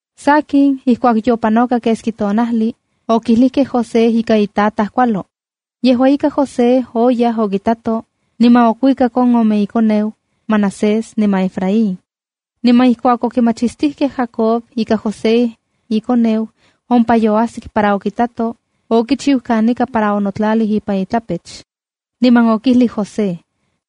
Sakin, ijkuak yopanoka keski tonajli, okilijkej José ika itataj kualo. Yejua ika, José oyaj okitato, niman okuikak on ome ikoneu, Manasés niman Efraín. Niman ijkuak okimachistijkej Jacob ika José, ikoneu, ompa yoajsik para okitato, okichiu kanika para onotlalij ipan itlapech. Niman okijlij José: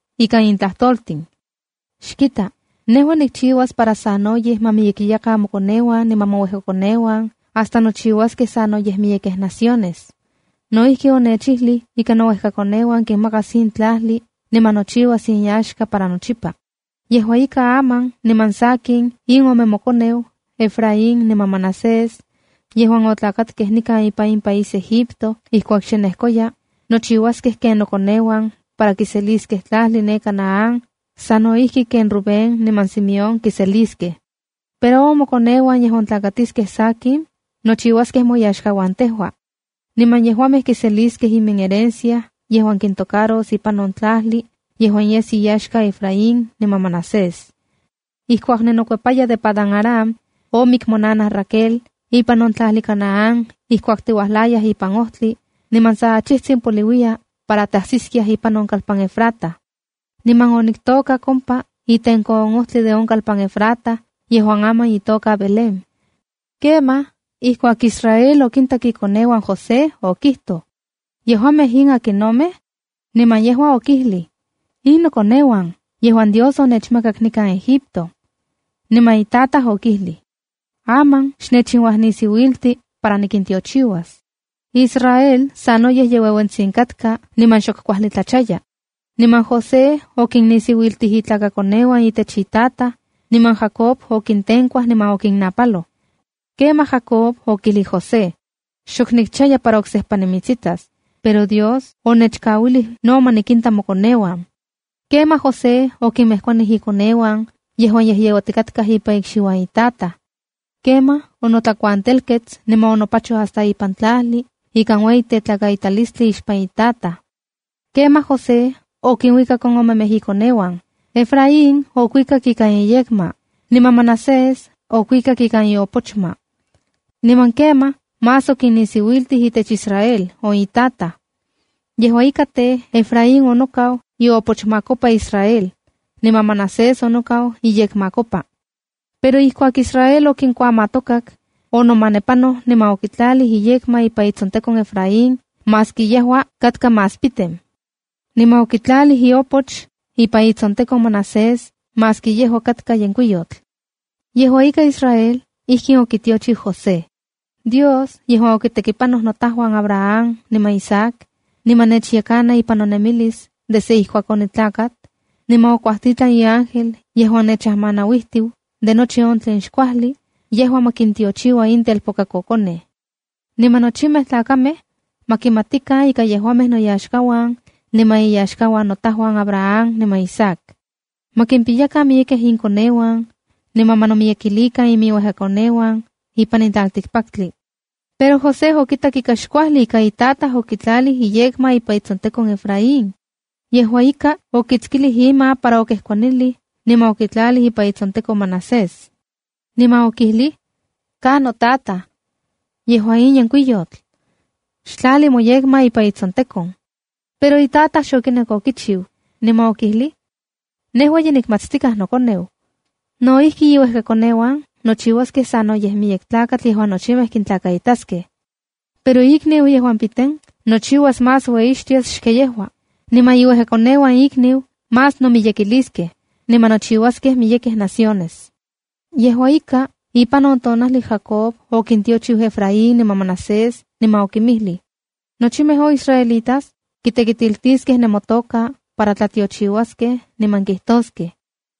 ika in tlajtoltin: “Xkita, nejua nikchiuas para sanoyej ma miyekiyakan mokoneuan niman mouejkakoneuan hasta nochiuaskej sanoyej miyekej naciones.” No ijki, onechijli ika nouejkakoneuan kinmakas in tlajli niman nochiuas inyaxka para nochipa. Yejua ika, aman niman sakin in ome mokoneu, Efraín niman Manasés, yejuan otlakatkej nikan ipan in país Egipto ijkuak xe nejkoya, nochiuaskej ken nokoneuan para kiseliskej tlajli ne Canaán sa no ijki ken Rubén niman Simeón kiseliskej. Pero on mokoneuan yejuan tlakatiskej sakin nochiuaskej moyaxkauan tejua. Niman yejuamej kiseliskej iminherencia yejuan kintocaros ipan on tlajli yejuan yes inyaxka Efraín niman Manasés. Ijkuak ninokuepaya de Padan-aram, omik monanaj Raquel ipan on tlajli Canaán ijkuak tiuajlayaj ipan ojtli, niman sa achijtsin poliuiya para tajsiskiaj ipan on kalpan Efrata. Niman oniktokak ompa itenko on ojtli de on kalpan Efrata yejuan aman itoka Belén. Kemaj, ijkuak Israel okintak ikoneuan José, okijtoj: —¿Yejuamej in akinnomej? Niman yejua okijlij: —In nokoneuan yejuan Dios onechmakak nikan Egipto. Niman itataj okijlij: —Aman xnechinuajnisiuilti para nikintiochiuas. Israel sanoyej ye ueuentsitsin katka niman xok kuajli tlachaya. Niman José okinnisiuiltij itlakakoneuan itech itataj, niman Jacob okintenkuaj niman okinnapaloj. Kemaj Jacob okijlij José: —Xok nikchaya para oksejpa nimitsitas, pero Dios onechkauilij no ma nikinta mokoneuan. Kemaj José okinmejkuanij ikoneuan yejuan yejyeuatikatkaj ipan ikxiuan itataj. Kemaj onotlakuantelkets niman onopachoj hasta ipan tlajli ikan ueyi tetlakaitalistli ixpan itataj. Kemaj José okinuikak on omemej ikoneuan. Efraín okuikak ikan iyekma, niman Manasés okuikak ikan iopochma. Niman kemaj más okinnisiuiltij itech Israel on itataj. Yejua ika tej, Efrain onokau iopochmakopa Israel, niman Manasés onokau iyekmakopa. Pero ijkuak Israel okinkuamatokak, onomanepanoj niman okitlalij iyekma ipan itsontekon Efraín maski yejua katka más piten. Niman okitlalij iopoch ipan itsontekon Manasés maski yejua katka yenkuiyotl. Yejua ika, Israel ijkin okitiochiu José: “Dios yejuan okitekipanokej notajuan Abraham niman Isaac, niman nechajyekana ipan nonemilis desde ijkuak onitlakat, niman okuajtitlan iángel yejuan nechajmanauijtiu de nochi on tlen xkuajli, yejua ma kintiochiua in telpokakokonej. Niman nochimej tlakamej ma kimatikan ika yejuamej noyaxkauan, niman iyaxkauan notajuan Abraham niman Isaac. Ma kimpiyakan miyekej inkoneuan niman ma nomiyekilikan iminuejkakoneuan ipan in tlaltikpaktli.” Pero José okitak xkuajli ika itataj okitlalij iyekma ipan itsontekon Efraín. Yejua ika, okitskilij ima para okejkuanilij niman okitlalij ipan itsontekon Manasés. Niman okijlij: —¡Ka notataj! In yejua yenkuiyotl. Xtlali moyekma ipan itsontekon. Pero itataj xokinek okichiu, niman okijlij: —Nejua ye nikmatztikaj nokoneu. No ijki, iuejkakoneuan nochiuaskej sanoyej miyek tlakatl yejuan nochimej kintlakaitaskej. Pero ikniu piten nochiuas más ueyixtias xken yejua, niman iuejkakoneuan ikniu más nomiyekiliskej, niman nochiuaskej miyekej naciones. Yejua ika, ipan on tonajli, Jacob okintiochiu Efraín niman Manasés niman okinmijlij: —Nochimej on israelitas kitekitiltiskej nemotoka para tlatiochiuaskej niman kijtoskej: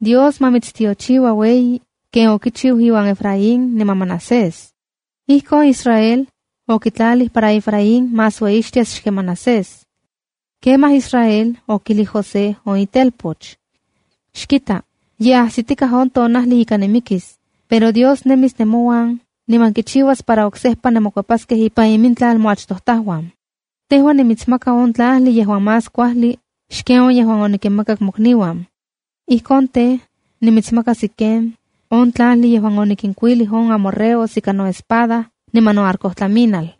“Dios ma mitstiochiua ueyi ken okichiu iuan Efraín niman Manasés.” Ijkon Israel okitlalij para Efraín más ueyixtias xken Manasés. Kemaj Israel okijlij José, on itelpoch: —Xkita, ye ajsitikaj on tonajli ika nimikis, pero Dios nemis nemouan niman kichiuas para oksejpa nemokuepaskej ipan imintlal moachtojtajuan. Tejua nimitsmaka on tlajli yejuan más kuajli xken on yejuan onikinmakak mokniuan. Ijkon tej, nimitsmaka Siquem, on tlajli yejuan onikinkuilij on amorreos ika noespada niman noarcotlaminal.